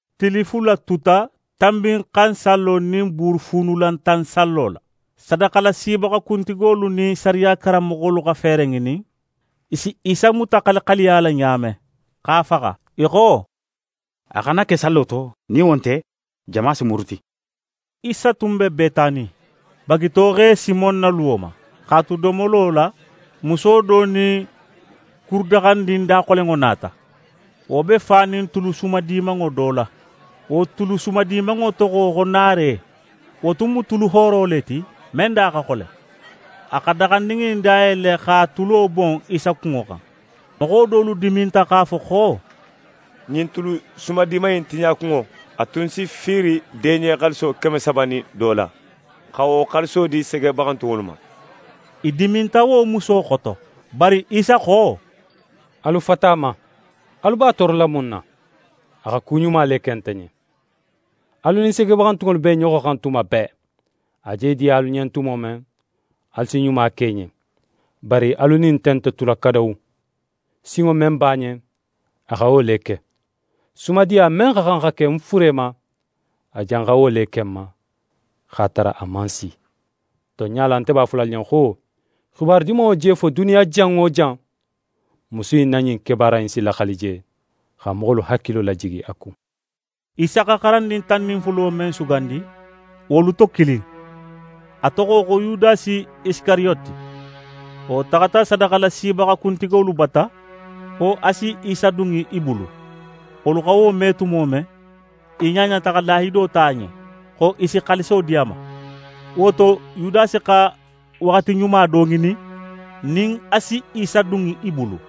Tili fula tuta Tanbinxansallo nin Buurufuunulantan sallo la, sadaxalasibaxa kuntigolu nin sariya karanmoxolu xa feere ŋinin, i si Isa muta xalixaliya la ɲa men, x'a faxa. I xo: «A xana ke sallo to, nin wo nte, jama si muruti.» Isa tun be Betani, bagitoxe Simon na luwo ma. X'a tu domolo la, muso do nin kurudaxandin daxolenŋo nata. Wo be fanin tulu sumadimanŋo do la. Wo tulu sumadimanŋo toxo xo nare. Wo tun mu tulu hooro le ti, men da xa xole. A xa daxandin in dayele, x'a tulo bon Isa kunŋo xan. Moxo dolu diminta x'a fo xo: «Ɲin tulu sumadiman in tiɲa kunŋo? A tun si fiiri deɲe xaaliso keme saba nin do la, xa wo xaaliso di segebaxantunŋolu ma.» I diminta wo muso xoto. Bari Isa xo: «Alu fata a ma, alu b'a toorola mun na? A xa ku ɲuma le ke nte ɲen. Alu nin segebaxantunŋolu be i ɲoxo xan tuma bee, a je diya alu ɲen tumo men, alu si ɲuma ke i ɲen. Bari alu nin nte nte tula kadawu. Sinŋo men b'a ɲen, a xa wo le ke. Sumadiya men xa xan xa ke ń fure ma, a janxa wo le ke ń ma, x'a tara a man si. Tonɲa la, nte b'a fola alu ɲen xo: xibaru Dimanŋo je fo duniya jan wo jan, musu in na ɲin kebaara in si laxali je, xa moxolu hakilo lajigi a kun.» Isa xa xarandin tan nin fulo men sugandi, wolu to kilin, a toxo xo Yudasi Isikariyoti, wo taxata sadaxalasibaxa kuntigolu bata, xo a si Isa dun i bulu. Wolu xa wo me tumo men, i ɲaɲata, xa lahido ta a ɲen, xo i si xaaliso di a ma. Wo to, Yudasi xa waxati ɲuma do ŋinin, nin a si Isa dun i bulu.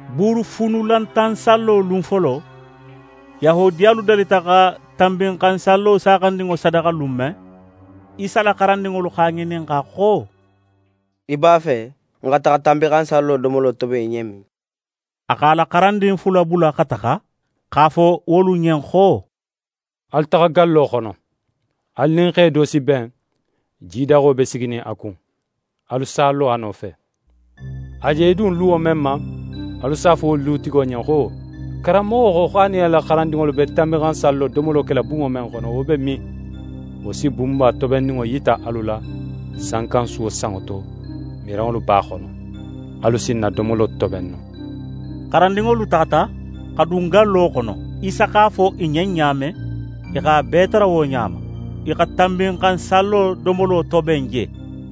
Buurufuunulantan sallo lun folo, Yahudiyalu dalita xa Tanbinxansallo saaxandinŋo sadaxa lun men, Isa la xarandinŋolu x'a ŋininxa xo: «Í b'a fe n xa taxa Tanbinxansallo domolo toben í ɲen min?» A x'a la xarandin fula bula xa taxa, x'a fo wolu ɲen xo: «Alu taxa gallo xono. Alu nin xe do si ben, jidaxo be siginin a kun, alu s'a lo a nofe. A je dun luwo men ma, alu s'a fo wo lutigo ɲen xo: “Karanmoxo xo, xo a nin a la xarandinŋolu be Tanbinxansallo domolo kela bunŋo men xono, wo be min.” Wo si bunba tobenninŋo yita alu la sankansuwo sanŋo to, miranŋolu b'a xono. Alu si n na domolo toben non.» Xarandinŋolu taxata, xa dun gallo xono. Isa x'a fo i ɲen ɲa men, i x'a bee tara wo ɲa ma. I xa Tanbinxansallo domolo toben je.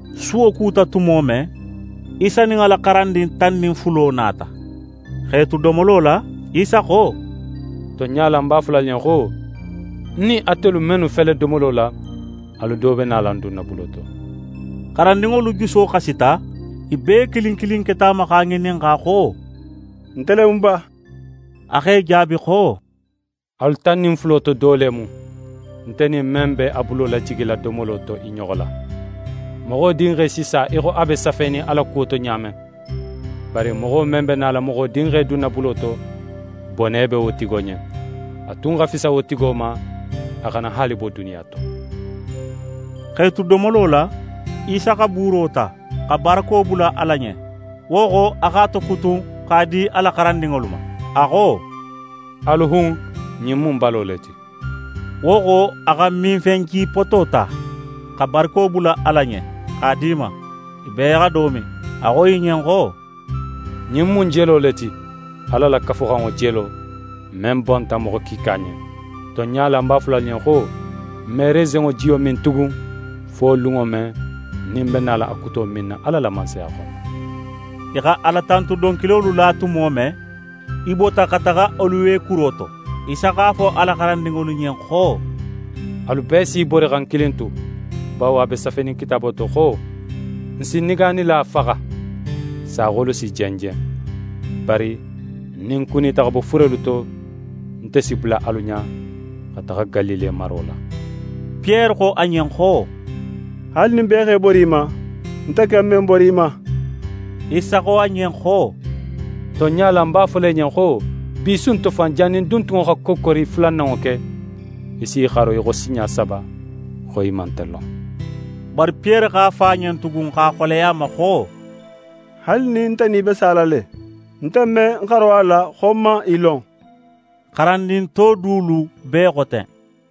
Suwo kuta tumo men, Isa nin a la xarandin tan nin fulo nata. X'e tu domolo la, Isa xo: «Tonɲa la, ń b'a fola alu ɲen xo, ń nin atelu mennu fele domolo la, alu do be nala ń dunna bulo to.» Xarandinŋolu juso xasita. I bee kilin kilin keta a ma x'a ŋininxa xo: «Nte le mu ba?» A x'e jaabi xo: «Alu tan nin fulo to do le mu, nte nin men be a bulo lajigila domolo to i ɲoxo la. Moxo Dinxe si sa í xo a be safenin a la kuwo to ɲa men. Bari moxo men be nala Moxo Dinxe dunna bulo to, bone be wo tigo ɲen. A tun xa fisa wo tigo ma, a xana haali bo duniya to.» X'e tu domolo la, Isa xa buuro ta, xa barako bula Ala ɲen. Wo xo, a x'a tokutun x'a di a la xarandinŋolu ma, a xo: «Alu hun! Ɲin mu ń balo le ti.» Wo xo, a xa minfen jipoto ta, xa barako bula Ala ɲen, x'a di i ma. I bee xa do min. A xo i ɲen xo: «Ɲin mu ń jelo le ti, Ala la Kafuxanŋo jelo, men bonta moxo kiika ɲen. Tonɲa la, ń b'a fola alu ɲen xo, ń me resenŋo jiyo min tugun, fo lunŋo men, nin ń be nala a kuto minna Ala la Mansaya xono.» I xa Alatantu donkilolu la tumo men, i bota xa taxa Oliwe kuro to. Isa x'a fo a la xarandinŋolu ɲen xo: «Alu bee si i bori xa ń kilin tu, bawo a be safenin Kitaabo to xo: “Ń si negaanila faxa, saaxolu si jenjen.” Bari nin ń kunita xa bo furelu to, nte si bula alu ɲa xa taxa Galile maro la.» Piyere xo a ɲen xo: «Haali nin bee x'e bori í ma, nte ken me ń bori í ma.» Isa xo a ɲen xo: «Tonɲa la, ń b'a fola í ɲen xo, bi su in to fan, jannin duntunŋo xa kokori fulananŋo ke, í si í xaro í xo sinɲa saba, xo í man nte lon.» Bari Piyere x'a fo a ɲen tugun, x'a xoleya a ma xo: «Haali nin nte nin í be sala le, nte me ń xaro a la, xo ń man í lon.» Xarandin to dulu bee xo ten.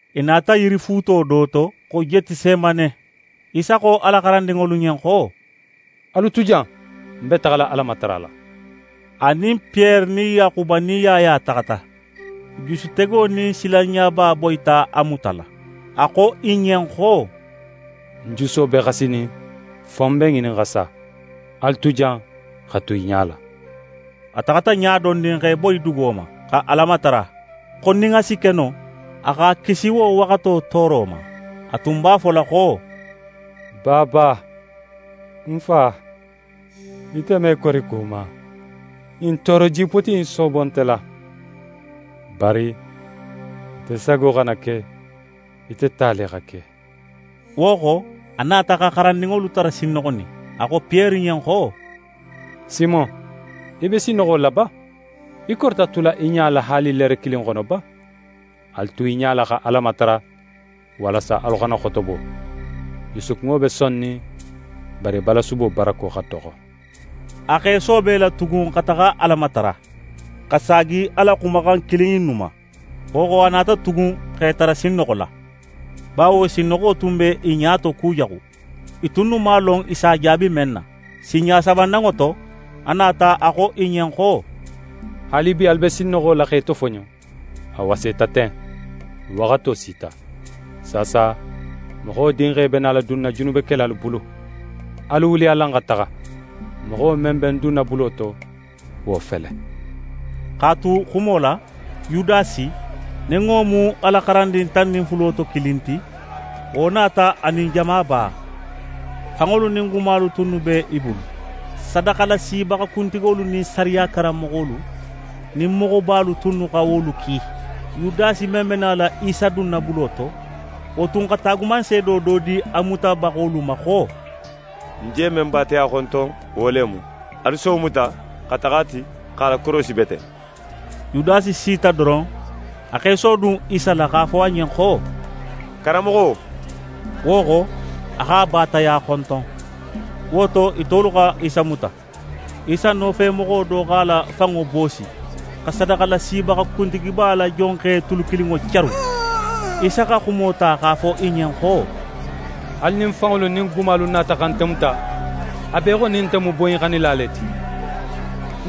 I nata yirifuuto do to, xo Jetisemane. Isa xo a la xarandinŋolu ɲen xo: «Alu tu jan, ń be taxala Ala matarala.» A nin Piyere nin Yaxuba nin Yaya taxata. Jusutego nin silanɲaba boyita a mutala. A xo i ɲen xo: «Ń juso be xasinin, fo ń be ŋinin xa sa. Alu tu jan, xa tu i ɲala.» A taxata ɲa dondin, x'é boyi dugo ma, xa Ala matara, xo nin a si ke no, a x'a kisi wo waxato tooro ma. A tun b'a fola xo: «Baaba, ń Fa, ite me kori ku ma. Ɲin tooro jipoti in soobo nte la! Bari nte sago xana ke, ite ta le xa ke!» Wo xo, a nata, xa xarandinŋolu tara sinnoxonin. A xo Piyere ɲen xo: «Simon, í be sinnoxola ba? Í korita tula í ɲala haali leere kilin xono ba? Alu tu i ɲala xa Ala matara, walasa alu xana xotobo. Jusukunŋo be sonnin, bari balasubo barako xa doxo.» A x'é soobo i la tugun xa taxa Ala matara, xa saagi a la xumaxan kilin innu ma. Wo xo, a nata tugun x'e tara sinnoxola, bawo sinnoxo tun be i ɲa to kujaxu. I tunnu man a lon i s'a jaabi men na. Sinɲa sabananŋo to, a nata, a xo i ɲen xo: «Haalibi alu be sinnoxola, x'e tofoɲo. A waseta ten. Waxato sita. Saasa, Moxo Dinxe be nala dunna junubekelalu bulu. Alu wuli, alan xa taxa. Moxo men be ń dunna bulo to, wo fele.» X'a tu xumo la, Yudasi, nin wo mu a la xarandin tan nin fulo to kilin ti, wo nata, a nin jamaba. Fanŋolu nin gumalu tunnu be i bulu. Sadaxalasibaxa kuntigolu nin sariya karanmoxolu nin moxobalu tunnu xa wolu ki. Yudasi, men be nala Isa dunna bulo to, wo tun xa taagumanseedo do di a mutabaxolu ma xo: «Ń je men baataya xonton, wo le mu. Alu si wo muta, xa taxa a ti, x'a lakorosi bete.» Yudasi sita doron, a x'é sodun Isa la x'a fo a ɲen xo: «Karanmoxo!» Wo xo, a x'a baataya xonton. Wo to, i tolu xa Isa muta. Isa nofemoxo do x'a la fanŋo boosi, xa sadaxalasibaxa kuntigiba la jonxe tulu kilinŋo carun. Isa xa xumo ta x'a fo i ɲen xo: «Alu nin fanŋolu nin gumalu nata xa nte muta, a be í xo nin nte mu boyinxannila le ti.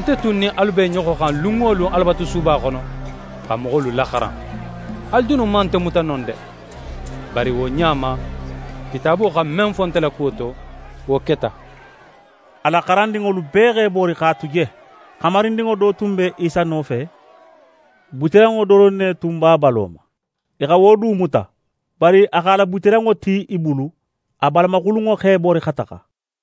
Nte tun nin alu be i ɲoxo xan lun wo lun Alabatusuba xono, xa moxolu laxaran. Alu dunnu man nte muta non de! Bari wo ɲa ma, Kitaabo xa men fo nte la kuwo to, wo keta.» A la xarandinŋolu bee x'e bori, x'a tu je. Xamarindinŋo do tun be Isa nofe; butiranŋo doron ne tun b'a balo ma. I xa wo du muta. Bari a x'a la butiranŋo tu i bulu, a balamaxulunŋo x'é bori xa taxa.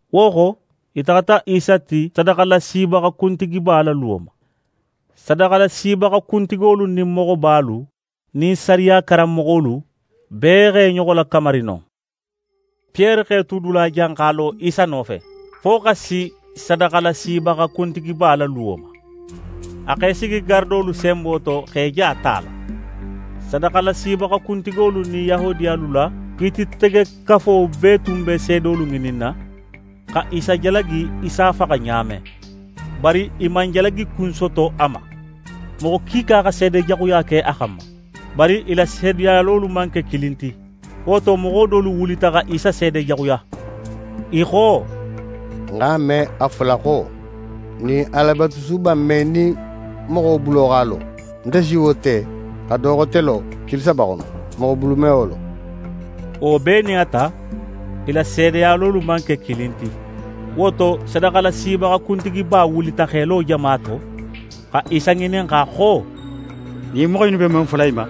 Wo xo, i taxata Isa ti sadaxalasibaxa kuntigiba la luwo ma. Sadaxalasibaxa kuntigolu nin moxobalu nin sariya karanmoxolu bee x'e ɲoxo lakamari non. Piyere x'é tu dulajan, x'a lo Isa nofe, fo xa si sadaxalasibaxa kuntigiba la luwo ma. A x'é sigi garadolu senbo to, x'é ja ta la. Sadaxalasibaxa kuntigolu nin Yahudiyalu la Kiititegekafo bee tun be seedolu ŋininna, xa Isa jalagi, i s'a faxa ɲa men. Bari i man jalagikun soto a ma. Moxo kiika xa seedejaxuya ke a xanma. Bari i la seedeyalolu man ke kilin ti. Wo to, moxo dolu wulita xa Isa seedejaxuya. I xo: «N x'a me a fola xo: “Ɲin Alabatusuba in men, nin moxo bulo x'a lo, nte si wo te, xa do xote lo tili saba xono. Moxo bulu me wo lo.”» Wo bee nin a ta, i la seedeyalolu man ke kilin ti. Wo to, sadaxalasibaxa kuntigiba wulita x'é lo jama to, xa Isa ŋininxa xo: «Ɲin moxo innu be men fola í ma,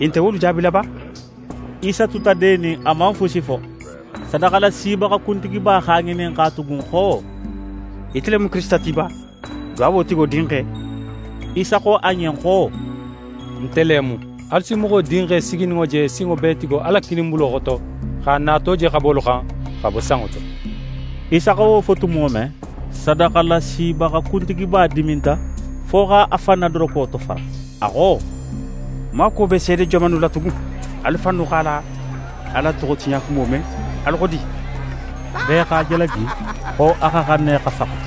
í nte wolu jaabila ba?» Isa tuta denin, a man fusi fo. Sadaxalasibaxa kuntigiba x'a ŋininxa tugun xo: «Ite le mu Kirisita ti ba, Duwawotigo Dinxe?» Isa xo a ɲen xo: «Nte le mu. Alu si Moxo Dinxe sigininŋo je Sinŋobeetigo Ala kininbulo xoto, x'a nato je xabolu xan, xa bo sanŋo to.» Isa xa wo fo tumo men, sadaxalasibaxa kuntigiba diminta fo x'a fan na doroko tofara. A xo: «N maakuwo be seede jomannu la tugun? Alu fannu x'a la Ala toxotiɲaxumo me. Alu xo di?» Bee x'a jalagi, xo a xa xan ne xa faxa.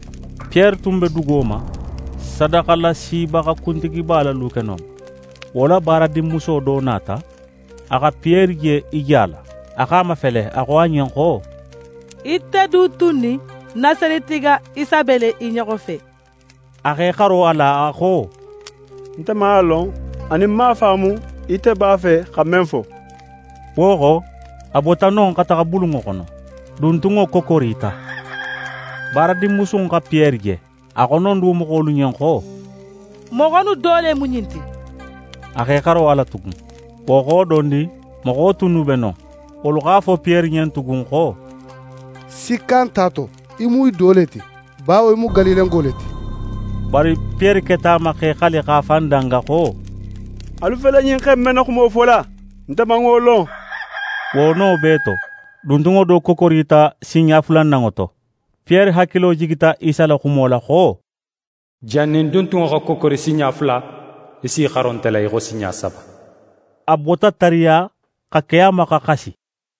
Piyere tun be dugo ma, sadaxalasibaxa kuntigiba la lukeno ma. Wo la baaradinmuso do nata. A xa Piyere je í jala. A x'a mafele, a xo a ɲen xo: «Ite du tun nin Nasaretinga Isa be le i ɲoxo fe!» A x'é xaro a la xo: «Nte man a lon, anin ń man a faamu, ite b'a fe xa men fo.» Wo xo, a bota non xa taxa bulunŋo xono. Duntunŋo kokorita. Baaradinmusu in xa Piyere je. A xo non du moxolu ɲen xo: «Moxo innu do le mu ɲin ti.» A x'é xaro a la tugun. Wo xo dondin, moxo tunnu be non, wolu x'a fo Piyere ɲen tugun xo: «Sikka nt'a to, í mu i do le ti, bawo í mu Galilengo le ti.» Bari Piyere keta a ma x'é xali x'a fan danga xo: «Alu fele ɲin xe in men na xumo fola, nte man wo lon!» Wo no bee to, duntunŋo do kokorita sinɲa fulananŋo to. Piyere hakilo jigita Isa la xumo la xo: «Jannin duntunŋo xa kokori sinɲa fula, í s'í xaro nte la í xo sinɲa saba.» A bota tariya, xa ke a ma xa xasi.